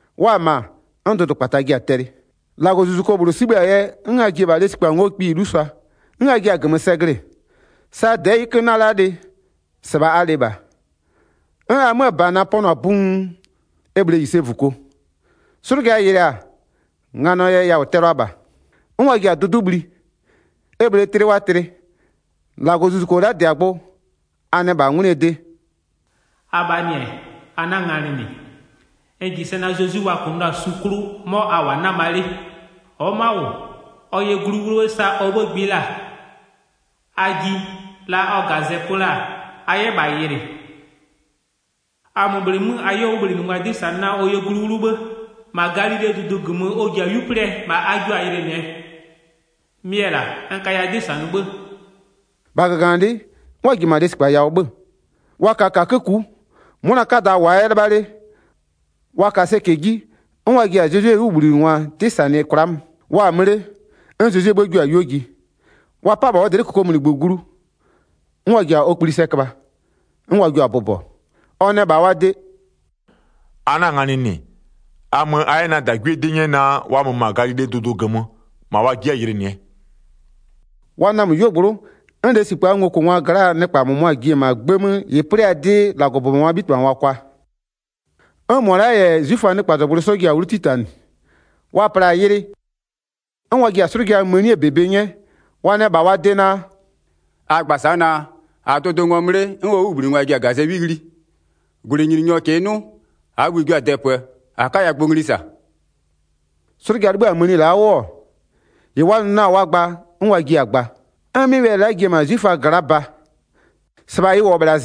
Wa-a -ma, 'n dʋdʋkpata ji-a tɛlɩ, -Lagɔzuzuko -bhlʋ 'sibhë-a yɛ 'n a ji-e -bha lesikpa ngo'oo kpiyi 'lusʋa, 'n a jiɛ-a -gömö sɛ glɩ-ɩ. Sa -dɛɛ 'yɩkö 'nɩ-ɛ la'a lɩ, -sɩbha a lɩ -bha, 'n a 'möö -bana pɔnʋ-a buun, e -bhlee -yisevuko. 'Slʋja yɩlɩa-a, nganɔɔ yɛ yawʋ tɛlʋa -bha. 'N wa ji-a dʋdʋ'ʋ bhli, e -bhlee tlɩ wa tlɩ. 5-Lagɔzuzuko la'a -dɩ-a gbʋ, a nɛ -bha 'ngwlɩɛ de: “Abhaa -nɩ-ɛ, a 'na-a nganɩ -nɩ, n -ji sɛ Zezwi-i wa kʋnʋ la-a su 'klʋ, 'mɔ a -wʋ-a 'nama 'le. Ɔ'ɔ ma'a -wʋ, ɔ yɛ glu 'wlʋ 'bhë sa ɔ 'bhë gbɩ la-a. A ji, la ɔ -gazɛ pö la-a, a 'yɛ -bha yɩlɩ. A mö bhleemö a 'yɛ ɔ 'wʋbhlinɩngwa 'dɩ -sanɩ naa ɔ yɛ glu 'wlʋ 'bhë, -ma Galilee dʋdʋ -gömö ɔ ji-a 'yu 'plɩɛ, -ma a jio-a yɩlɩnɩɛ. Mɩ-ɛ -la, n kaya 'dɩ -sanɩ 'bhë.” 8-Bha -gaganɩlɩ'ɩ, 'n wa ji-e -ma lesikpa yawʋ 'bhö-ö, wa ka -kakö ku'u, 'mʋna 'kada -wʋʋa 'yɛ 'lɩbha 'le, wa ka sɛcɛ 'ji 'n wa ji-a Zezwie 'wʋbhlinɩngwa 'dɩ -sanɩ kwla'a mö. Wa-a mö 'le, 'n Zezwie 'bhë jua-a 'yuo ji. Wa 'pa-a -bha ɔ dlɩ'ɩ -kokomunigbö glu, 'n wa ji-a ɔ kpli sɛ köbha, 'n wa jio-a bʋbɔ. Ɔ nɛ -bha wa de: “A 'na-a nganɩ -nɩ, a mö a 'yɛ na -dagwie 'dɩ nyɛ naa wa mö -ma Galilee dʋdʋ -gömö -ma wa ji'i-a yɩlɩnɩɛ.” Wa namö 'yuogblʋ'ʋ 'n lesikpaa ngokʋngwaa gla'aa nɩkpa -mʋmʋa ji-e -ma 'gbë 'mö -ɩ 'plɩ-aa 'dɩ -Lagɔbʋbɔngwaa 'bhitɩbhangwa kwa. 'N -mʋa la'a -yɛ 'zwiföaa nɩkpazɔgblʋɩ 'sɔ ji-a 'wlu 'titanɩ, wa pla-a yɩlɩ, 'n wa ji-a 'slʋja mënie -bebe 'nyɛ. Wa nɛ -bha wa de naa: “A gba sa'a naa: -A-a dʋdʋ ngɔmö 'le, 'n ɔ 'wʋbhlinɩngwa ji-a ɔ -gazɛ 'wi ghli. 14-Gwlɩnyininyɔ -kɩɩ 'nʋ, -aa bhï-ï jio-a dɛpöö -a 'kaya gbʋ ngli -sa.” 'Slʋja 'libhïa mëni la'a 'wʋ-ɔ, -ɩ wa nʋ la-a wa gba, 'n wa jiɩ-a gba. 'N 'mɩ wɛlɩ la'a ji-e -ma 'zwiföa gla'a ba. -Sɩbha ɩ -wʋ-ɔ -bhla -zɩnɩ'ɩ.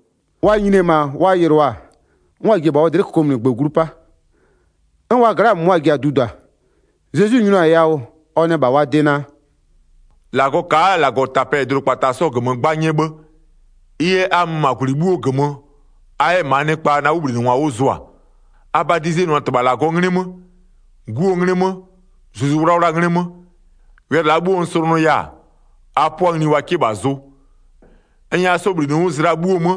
Wa nyini-e -ma wa yɩlɩɔ-a, 'n wa ji-e -bha ɔ dlɩ'ɩ -kokomunigbö glu 'pa. 'N wa gla'aa -mʋmʋa ji-a dudua. Zezwi nyinʋa-a yawʋ ɔ nɛ -bha wa de naa: “-Lagɔ ka'a -Lagɔtapɛ -yɛ dʋdʋkpata 'sɔɔ -gömö 'gba 'nyɛ 'bhë. Ɩ yɛ a mö -ma -gwlɩ 'bhuo -gömö, a 'yɛ -maa nɩkpa na 'wʋbhlinɩngwa 'wʋ zʋa. A badizenʋa -Tɩbha -Lagɔɔ 'nglɩ 'mö, 'Guo 'nglɩ 'mö, Zuzu 'Wlawlaa 'nglɩ 'mö. Wɛlɩ la'a 'bhuo n slʋnʋya-a, a 'pʋa ngli wa 'kɩ -bha zʋ. N nyɛya 'sɔ -bhlinɩ 'wʋ zlɩa 'bhuo 'mö,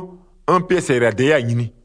'n pɩɛ sɛyɩlade 'yɛ-a nyini.”